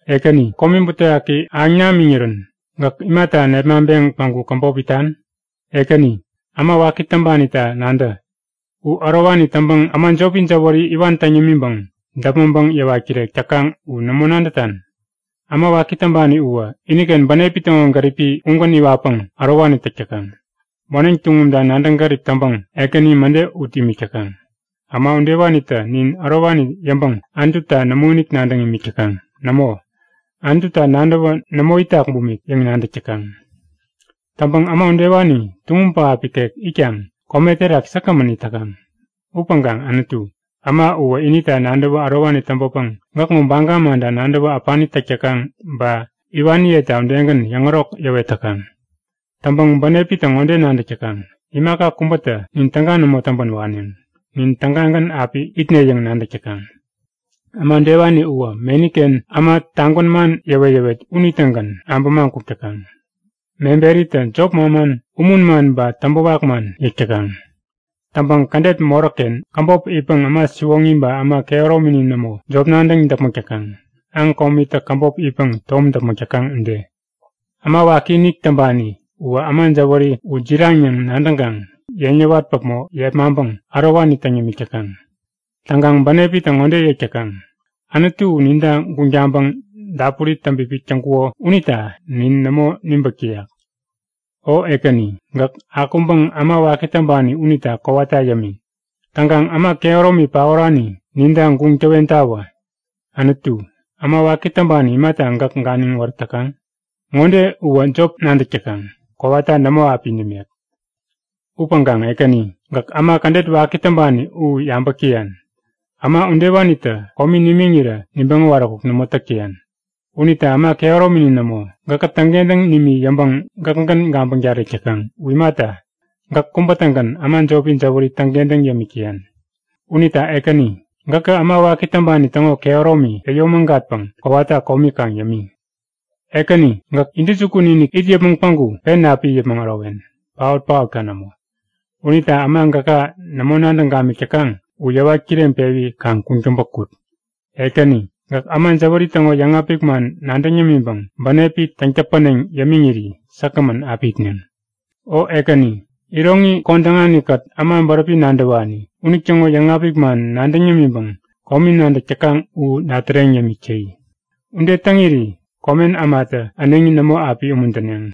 Ekäni, komi butewaki ahäŋ namiŋirän gäk imata nepmaŋpeŋ päŋku käbop itan? Ekäni, äma waki täŋpanita nadä! U ärowani täŋpäŋ äma jopi jäwäri iwan täŋ yämiŋpäŋ däpmäŋpäŋ yäwat-kirek täkaŋ u nämo nadätan? Äma waki täŋpani uwä iniken bänepi täŋo gäripi ugän iwatpäŋ ärowani täk täkaŋ. Moneŋ tuŋumta nadäŋgärip täŋpäŋ Ekäni mäde ut imik täkaŋ. Äma udewanitä nin ärowani yäŋpäŋ Anututa nämoinik nadäŋ imik täkaŋ. Nämo, Anututa nadäwä nämo itak bumik yäŋ nadäk täkaŋ. Täŋpäŋ äma udewani tuŋum pähap ikek itkaŋ kome terak säkgämän it täkaŋ. Upäŋkaŋ Anutu, äma uwä inita nadäwä ärowani täŋpäpäŋ gäkŋo baga manta nadäwä äpani täk täkaŋ ba iwaniyeta udegän yäŋärok yäwet täkaŋ. Täŋpäŋ bänepitä ŋode nadäk täkaŋ; Imaka kubätä nin täga nämo täŋpän waneŋ. Nin tägagän api itne yäŋ nadäk täkaŋ. Äma udewani uwä meniken äma tagwän man yäwet-yäwet unitägän abämaŋ kuk täkaŋ. Meberitä jop manman, umun man ba täŋpäwak man yäk täkaŋ. Täŋpäŋ kädet moräkken käbop itpäŋ äma siwoŋi ba äma kehäromini nämo, jop nadäŋ däpmäk täkaŋ, aŋ komitä käbop itpäŋ tom däpmäk täkaŋ ude. Äma wakiinik täŋpani uwä äma jäwäri u jiraŋ yäŋ nadäŋkaŋ yeŋ yäwat päpmo yepmaŋpäŋ ärowani täŋ yämik täkaŋ. Täŋkaŋ bänepitä ŋode yäk täkaŋ; Anutu u ninta guŋ taŋpäŋ dapuri täŋpipik täŋkuko unita nin nämo nibäk täyak yäk. O Ekäni, gäk akuŋpäŋ äma waki täŋpani unita kowata yämi! Täŋkaŋ äma kehäromi paorani ninta guŋ täwentawä! Anutu, äma waki täŋpani imata gäk ganiŋ wärät täkaŋ? Ŋode uwä jop nadäk täkaŋ; Kowata nämo api nimek! Upäŋkaŋ Ekäni, gäk äma kädet waki täŋpani u yabäk täyan. Äma udewanitä komi nimiŋirä nibäŋ äwaräkuk nämo täk täyan. Unita äma kehäromini nämo, gäkä täŋkentäŋ nimi yäŋpäŋ gäkgän gabäŋ tarek täkaŋ. U imata, gäk kubä-tägän äma jopi jäwäri täŋkentäŋ yämik täyan. Unita Ekäni, gäkä äma waki täŋpani täŋo kehäromi yäyomägatpäŋ kowata komi kaŋ yämi! Ekäni gäk intäjukun-inik it yäpmäŋ päŋku pen api it yäpmäŋ ärowen, paot-paotka nämo. Unita äma gäka nämo nadäŋ gamik täkaŋ u yäwat kireŋpewi kaŋ kuŋtäŋpä kut! Ekäni, gäk äma jäwäri täŋo yäŋapik man nadäŋ yämiŋpäŋ bänepi täŋ-täpäneŋ yämiŋiri säkgämän api itneŋ. O Ekäni, iroŋi kodäŋanikät äma bäräpi nadäwani unitäŋo yäŋapik man nadäŋ yämiŋpäŋ komi nadäk täkaŋ u dätäreŋ yämik täyi. Ude täŋiri komen ämata äneŋi nämo api umuntäneŋ!